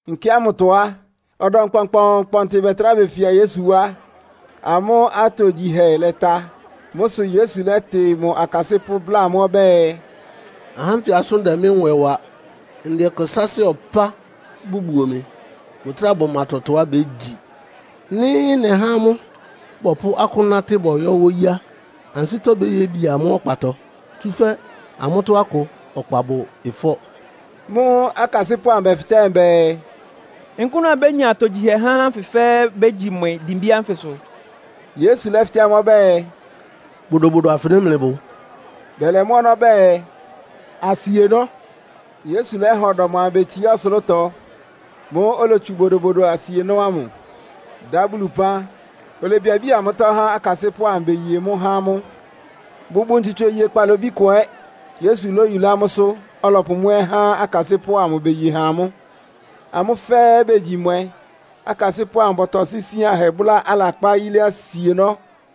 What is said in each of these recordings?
Nkɛ ámʋtɔ á, ɔdɔm kpɔnkpɔɔnkpɔntɩ bɛtrá befia Yesu wá. Amʋ́ atogyihɛ lɛta. Mʋ́ sʋ Yesu lɛ́tɩ mʋ akasɩ́pʋ́, bláa amʋ́ ɔbɛ́ɛ, “Ahá ánfɩ asʋ́n dɛ mɩ́ nwɛ wa. Ndɛ ɛkɛ sáásɩ́ ɔpá bʋbuo mɩ. Bʋtráa bʋma tɔtɔá bégyi. Nɩ́ nɛhá amʋ́ bɔpʋ́ akʋ́n nátɩ́ bɔyɔ́ wóyí á, ansɩ́tɔ́ béyébi amʋ́ ɔkpatɔ, tsúfɛ́ amʋ́tɔ́ akʋ ɔkpa bʋ ɩfɔ́.” Mʋ́ʋ́ akasɩ́pʋ́ amʋ bɛfɩtɛ́ mʋ bɛɛ, “Nkʋ́nʋ́ abénya atogyihɛ há ahá ánfɩ fɛ́ɛ́ bégyi mwɛ dimbí ánfɩsʋ.” Yesu lɛ́fɩtɛ́ amʋ́ ɔbɛ́ɛ, “Bodobodo afɩnɩ mlɩbʋ?” Bɛlɛ mʋ́ ɔnɔ́ bɛɛ, “Asienɔ́.” Yesu lɛ́ha ɔdɔm amʋ betsiá ɔsʋlʋ́tɔ. Mʋ́ʋ́ olotsu bodobodo asienɔ́ ámʋ, dá Bulu ɩpán, olebiabía mʋ́tɔ́ há akasɩ́pʋ́ amʋ beye mʋ́ há amʋ́. Bʋbʋ ntsutso iye bwáhɛ́ kpalobí kʋ ɛ́. Yesu lóyulá mʋ́sʋ́, ɔlɔpʋ mʋ́ ɛ́ há akasɩ́pʋ́ amʋ, beye ha amʋ́. Amʋ́ fɛ́ɛ́ begyi mwɛ. Akasɩ́pʋ́ amʋ bɔtɔsɩ́ isíanhɛ bʋ́lá alakpá yilé asienɔ́.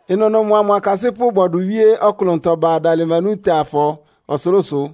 Ɩnʋnʋ mʋa mʋ akasɩ́pʋ́ bɔdʋ wíé ɔklʋntɔ ba Dalmanutafɔ ɔsʋlʋ́sʋ.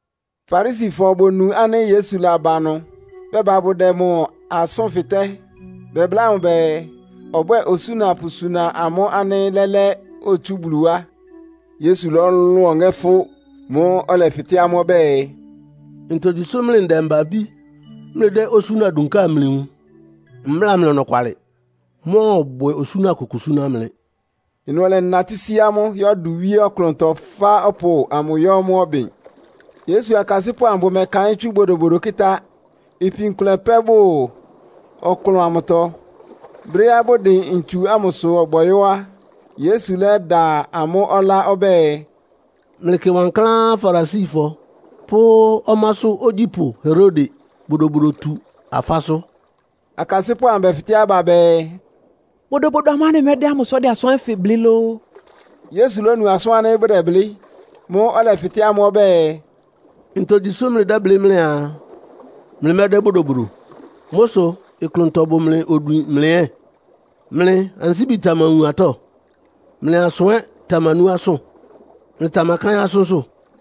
Farisifɔ bonu ánɩ́ Yesu laba ɩnʋ, bɛba bʋdɛ mʋ asʋ́n fɩtɛ́. Bɛbláa mʋ bɛɛ, ɔbwɛ́ɛ osúna pʋsuna amʋ́ ánɩ́ lɛ́lɛ́ otsú Bulu wá. Yesu lɔ́lʋn ɔŋɛ́ fʋ́. Mʋ́ʋ́ ɔlɛfɩtɛ́ amʋ́ ɔbɛ́ɛ, “Ntogyi sʋ́ mlɩ ndɛmba-abí mlɩdɛ́ osúna dunká amlɩwun? Mbláa mlɩ ɔnɔkwalɩ. Mmɔ́ɔbwɛ osúna kʋkʋ súná mlɩ!” Ɩnʋ ɔlɛnatɩ sí amʋ́, yɔ́ dʋ wíé ɔklʋntɔ, fá ɔpʋ ámʋ yɔ́ mʋ́ ɔbɩn. Yesu akasɩ́pʋ́ amʋ bʋmɛkaɩ́n tsú bodobodo kɩ́tá. Ipin kʋlɛ pɛ́ bʋ ɔklʋn amʋtɔ. Brɛ́á bʋdɩn ntsu ámʋsʋ bɔyɔ́ á, Yesu lɛ́da amʋ́ ɔlá ɔbɛ́ɛ, “Mlɩkɩ wankláán Farisifɔ pʋ́ ɔmásʋ́ ogyípʋ́ Herode bodobodotu-afásʋ́.” Akasɩ́pʋ́ amʋ bɛfɩtɛ́ aba bɛɛ, “Bodobodo amʋ́ʋ́ anɩmɛ́dɛ́ ámʋ sʋ́ ɔdɛ asʋ́n ánfɩ blɩ́ lóó?” Yesu lónu asʋ́n ánɩ́ bʋdɛblɩ́. Mʋ́ʋ́ ɔlɛfɩtɛ́ amʋ́ ɔbɛ́ɛ, “Ntogyi sʋ́ mlɩdɛ́blɩ́ mlɩaa, mlɩmɛ́dɛ́ bodobodo? Mʋ́ sʋ ɩklʋntɔ bʋ mlɩ odwin mlɩ ɛ́? Mlɩ ansíbi tamawun atɔ́, mlɩ asʋ ɛ́ tamanú asʋ́n? Mlɩtamakáɩ́n asʋ́nsʋ́?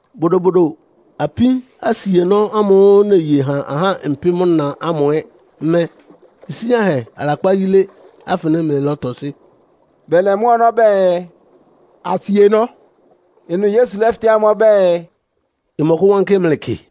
“Bodobodo apin asienɔ́ ámʋ́ʋ́ neye ha ahá mpɩ́m-na ámʋ ɛ́ mɛ́, isíanhɛ alakpá yílé afɩnɩ mlɩlɔ́tɔsɩ́?” Bɛlɛ mʋ́ ɔnɔ́ bɛɛ, “Asienɔ́.” Ɩnʋ Yesu lɛ́fɩtɛ́ amʋ́ ɔbɛ́ɛ, “Ɩmɔkʋ́wánkɩ́ mlɩ kɩ?”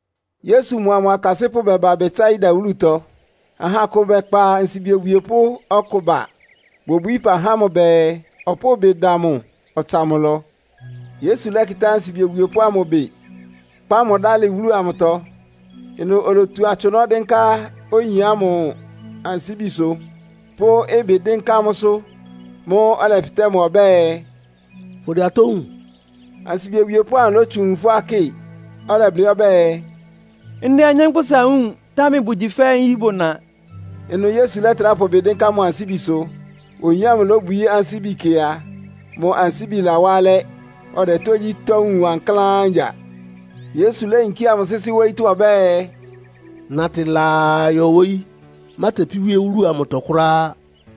Yesu mʋa mʋ akasɩ́pʋ́ bɛba Betsaida wúlutɔ. Aha akʋ bɛkpa ansibi obwiepʋ́ ɔkʋ ba. Bobwií ɩpa há mʋ bɛɛ, ɔpʋ́ʋ ɩbɩ da mʋ, ɔtsa mʋ ɩlɔ. Yesu lɛ́kɩtá ansibi obwiepʋ́ ámʋ ɩbɩ, kpá mʋ dálɩ wúlu amʋtɔ. Ɩnʋ olotu atsʋnɔ́ dɩ́nká oyin ámʋ ansíbisʋ, pʋ́ ɩbɩ dɩ́nká mʋsʋ. Mʋ́ʋ́ ɔlɛfɩtɛ́ mʋ ɔbɛ́ɛ, “Fʋdɛ atɔ́ wúun?” Ansibi obwiepʋ́ ámʋ lótsu nwun fʋ́á kɩ, ɔlɛblɩ́ ɔbɛ́ɛ, “Ndɛ anyánkpʋ́sa wúun, támɛ bʋgyi fɛ́ nyí bʋna.” Ɩnʋ Yesu lɛ́trá pʋ mʋ ɩbɩ dɩ́nká mʋ ansíbisʋ. Oyin ámʋ lóbwií ansíbi kɩ a, mʋ ansíbi lawá alɛ́, ɔdɛ tógyítɔ́ wúun wankláán ngya. Yesu léyinkía mʋ sɩ́sɩ́ wóyítɔ́ ɔbɛ́ɛ, “Natɩ laa yɔ wóyí. Mátepí wíé wúlu amʋtɔ kʋ́ráá.”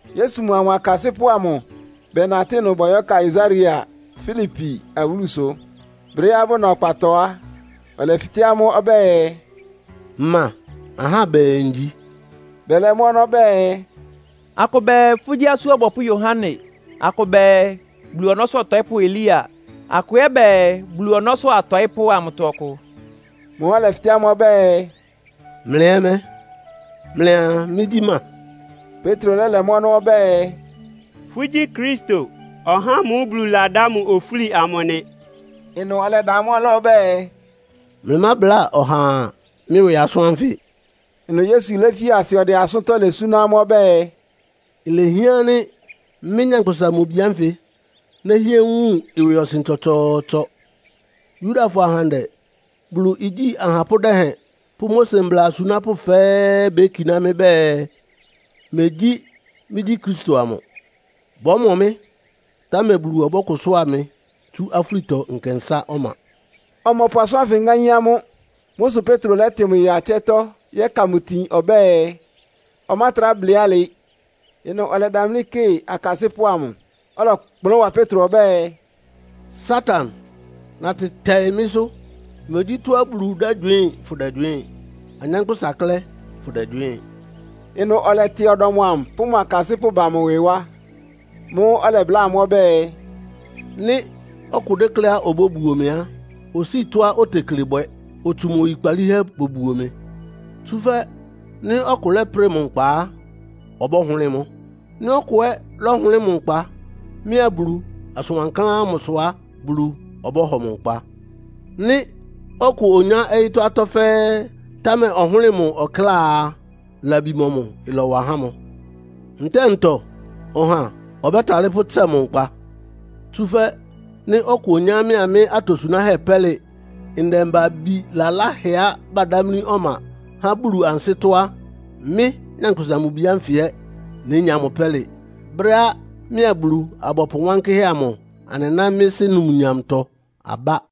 Yesu mʋa mʋ akasɩ́pʋ́ amʋ bɛnatɩ́ ɩnʋ bɔyɔ́ Kaesarea Filipi awúlusʋ. Brɛ́á bʋna ɔkpatɔ á, ɔlɛfɩtɛ́ amʋ́ ɔbɛ́ɛ, “Ma ahá bɛɛ ngyi?” Bɛlɛ mʋ́ ɔnɔ́ bɛɛ, “Akʋ bɛɛ, fʋ́gyí Asú Ɔbɔpʋ́ Yohane. Akʋ bɛɛ, Bulu ɔnɔ́sʋ́ ɔtɔɩ́pʋ́ Elia. Akʋ ɛ́ bɛɛ, Bulu ɔnɔ́sʋ́ atɔɩ́pʋ́ amʋtɔ ɔkʋ.” Mʋ́ʋ́ ɔlɛfɩtɛ́ amʋ́ ɔbɛ́ɛ, “Mlɩ ɛ́ mɛ́? Mlɩa mɩ́gyí ma?” Petro lɛ́lɛ mʋ́ ɔnɔ́ ɔbɛ́ɛ, “Fʋ́gyí Kristo, (ɔhá ámʋ́ʋ́ Bulu ladá mʋ ofúli amʋ) nɩ.” Ɩnʋ ɔlɛda amʋ́ ɔlá ɔbɛ́ɛ, “Mlɩmábláa ɔhaa mɩ́ ɩwɩ asʋ́n ánfɩ.” Ɩnʋ Yesu léfi asɩ ɔdɛ asʋ́ntɔ́ lɛ súná amʋ́ ɔbɛ́ɛ, “Ilehián ánɩ́ mɩ́, Nyankpʋsa-Mʋ-Bi ánfɩ nɛ́hɩɛ wun ɩwɩɔsɩn tsɔtsɔɔtsɔ. Yudafɔ ahandɛ, Bulu igyí ahapʋ́ dɛhɛn pʋ́ Mose mbla asunápʋ́ fɛ́ɛ́ bekiná mɩ́ bɛɛ, megyí mɩ́gyí Kristo amʋ. Bɔ́mɔ mɩ́, támɛ Bulu ɔbɛ́lakʋ́sʋ́a mɩ tsú afúlitɔ nkɛnsá ɔma.” Ɔmɔpʋ asʋ́n ánfɩ ŋáín amʋ́. Mʋ́ sʋ Petro lɛ́tɩ mʋ ya ɩtsɛ́tɔ́ yɛ́ka mʋ itin ɔbɛ́ɛ, ɔmátrá blɩ́ alɩ. Ɩnʋ ɔlɛdamlí kɩ akasɩ́pʋ́ amʋ, ɔlɔkplʋ́n wa Petro ɔbɛ́ɛ, “Satan, natɩ tɛɩ mɩ́sʋ́! Megyí tɔ́á Bulu dɛ́gywɩɩ́n fʋdɛgywɩɩ́n, anyánkpʋ́sa klɛ́ fʋdɛgywɩɩ́n.” Ɩnʋ ɔlɛtɩ ɔdɔm amʋ pʋ́ mʋ akasɩ́pʋ́ ba mʋ ɩwɩ wá. Mʋ́ʋ́ ɔlɛbláa amʋ́ ɔbɛ́ɛ, “Nɩ́ ɔkʋ dékléá obóbuo mɩ á, osíi tɔ́á otekle bwɛ, otsu mʋ oyikpalíhɛ bobuo mɩ. Tsúfɛ́ nɩ́ ɔkʋ lɛ́prɩ mʋ nkpa á, ɔbɔ́hʋlɩ́ɩ mʋ́. Nɩ́ ɔkʋ ɛ́ lɔ́hʋlɩ́ɩ mʋ nkpa mɩ́a Bulu asʋn wankláán ámʋsʋ á, Bulu ɔbɔ́hɔ mʋ nkpa. Nɩ́ ɔkʋ onyá ɔyɩ́tɔ́ atɔ́ fɛ́ɛ́, támɛ ɔhʋ́lɩ mʋ ɔkláa a, labi mɔmʋ ɩlɔwa há mʋ? Ntɛ́ɛ ntɔ ɔha ɔbɛ́talɩ́ pʋ́tsɛ mʋ nkpa? Tsúfɛ́ nɩ́ ɔkʋ onyá mɩ́a mɩ́ atosunáhɛ́ pɛ́lɩ ndɛmba-abí laláhɛá badámlí ɔma há Bulu ansɩ́tɔ́ á, mɩ́, Nyankpʋsa-Mʋ-Bi ánfɩ ɛ́ nénya mʋ pɛ́lɩ brɛ́á mɩ́a Bulu-abɔpʋ wánkɩ́hɛ́ amʋ anɩná mɩ́ Sɩ́ numnyamtɔ abá.”